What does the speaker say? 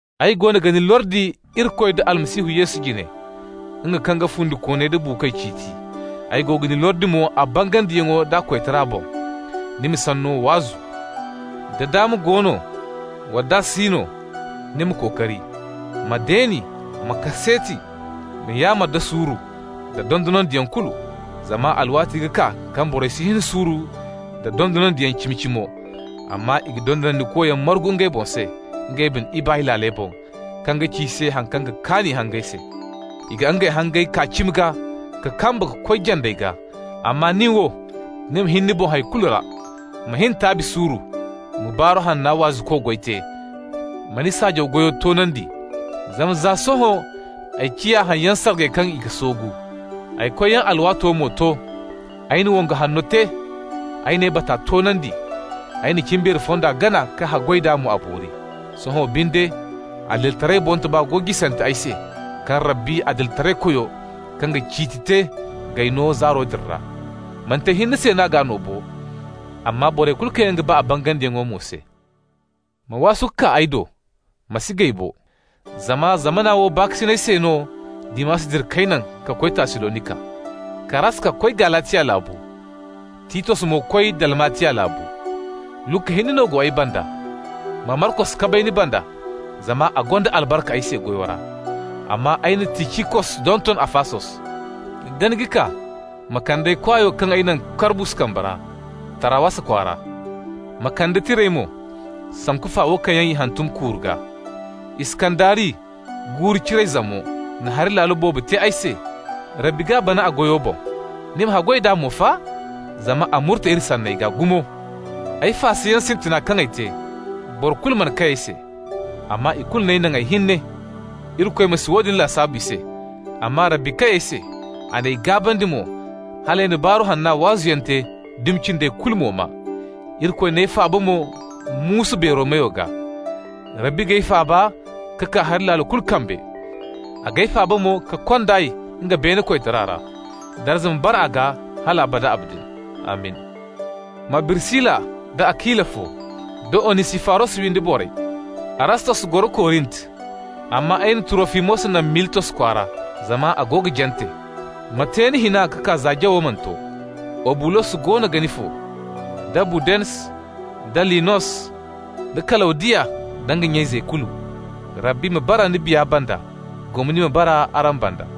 Ay goono ga ni lordi Irikoy da Almasihu Yesu jine, nga kaŋ ga fundikooney da buukoy ciiti, ay ga ni lordi mo a bangandiyaŋo d'a koytara boŋ: Ni ma Sanno waazu. Da daama go no, wala nd'a si no, ni ma kookari. Ma deeni, ma kaseeti, ma yaamar da suuru nda dondonandiyaŋ kulu. Zama alwaati ga kaa kaŋ borey si hin suuru nda dondonandiyaŋ cimi-cimo, amma i ga dondonandikoyaŋ margu ngey boŋ se, ngey bine ibaay laaley boŋ, kaŋ ga ci i se haŋ kaŋ ga kaan i hangey se. I ga ngey hangey kaa cimi gaa ka kamba ka koy jandey gaa. Amma ni wo, ni ma hin ni boŋ hay kulu ra. Ma hin taabi suuru, ma Baaru Hanna waazuko goyo te, ma ni saajaw goyo toonandi. Zama za sohõ ay ciya haŋyaŋ sargay kaŋ i ga soogu. Ay koyyaŋo alwaato mo to. Ay na wongu hanno te, ay n'ay bata toonandi, ay na cimbeero fonda gana ka haggoy d'a a ma boori. Sohõ binde adilitaray boŋtoba go jisante ay se, kaŋ Rabbi, Adilitaraykoyo kaŋ ga ciiti te, g'ay no zaaro din ra. Manti ay hinne se n'a g'a no bo, amma borey kulu kaŋ yaŋ ga ba a bangandiyaŋo mo se. Ma waasu ka kaa ay do, ma si gay bo. Zama zamana wo baakasinay sabbay se no Dimas dira k'ay naŋ ka koy Tassalonika. Karaska koy Galatiya laabu, Titos mo koy Dalmatiya laabu. Luka hinne no go ay banda. Ma Markos kabay ni banda, zama a gonda albarka ay se goyo ra. Amma ay na Ticikos donton Afasos. Da ni ga kaa, ma kande ay kwaayo kaŋ ay naŋ Karbus kambe ra Tarawasa kwaara. Ma kande tirey mo, sanku fa wo kaŋ yaŋ i hantum kuuru gaa. Iskandari, guuru-ciray zamo, na hari laalo boobo te ay se. Rabbi g'a bana a goyo boŋ. Ni ma haggoy d'a mo fa, zama a murte iri sanney gaa gumo. Ay faasayaŋ sintina kaŋ ay te, boro kulu mana kay ay se, amma i kulu n'ay naŋ ay hinne. Irikoy ma si woodin lasaabu i se. Amma Rabbi kay ay se. A n'ay gaabandi mo, hal ay na Baaru Hanna waazuyaŋo te, dumi cindey kulu mo maa. Irikoy n'ay faaba mo muusu beero meyo gaa. Rabbi g'ay faaba ka kaa hari laalo kulu kambe. A g'ay faaba mo ka kond'ay nga beene koytara ra. Darza ma bara a gaa hal abada abadin! Amin. Ma Birisila nda Akila fo, da Onisifaros windo borey. Arastos goro Korint, amma ay na Turofimos naŋ Militos kwaara, zama a go ga jante. Ma te ni hina ka kaa za jawo mana to. Obulos goono ga ni fo, da Budens da Linos da Kalawdiya nda nya-izey kulu. Rabbi ma bara ni biya banda. Gomni ma bara araŋ banda.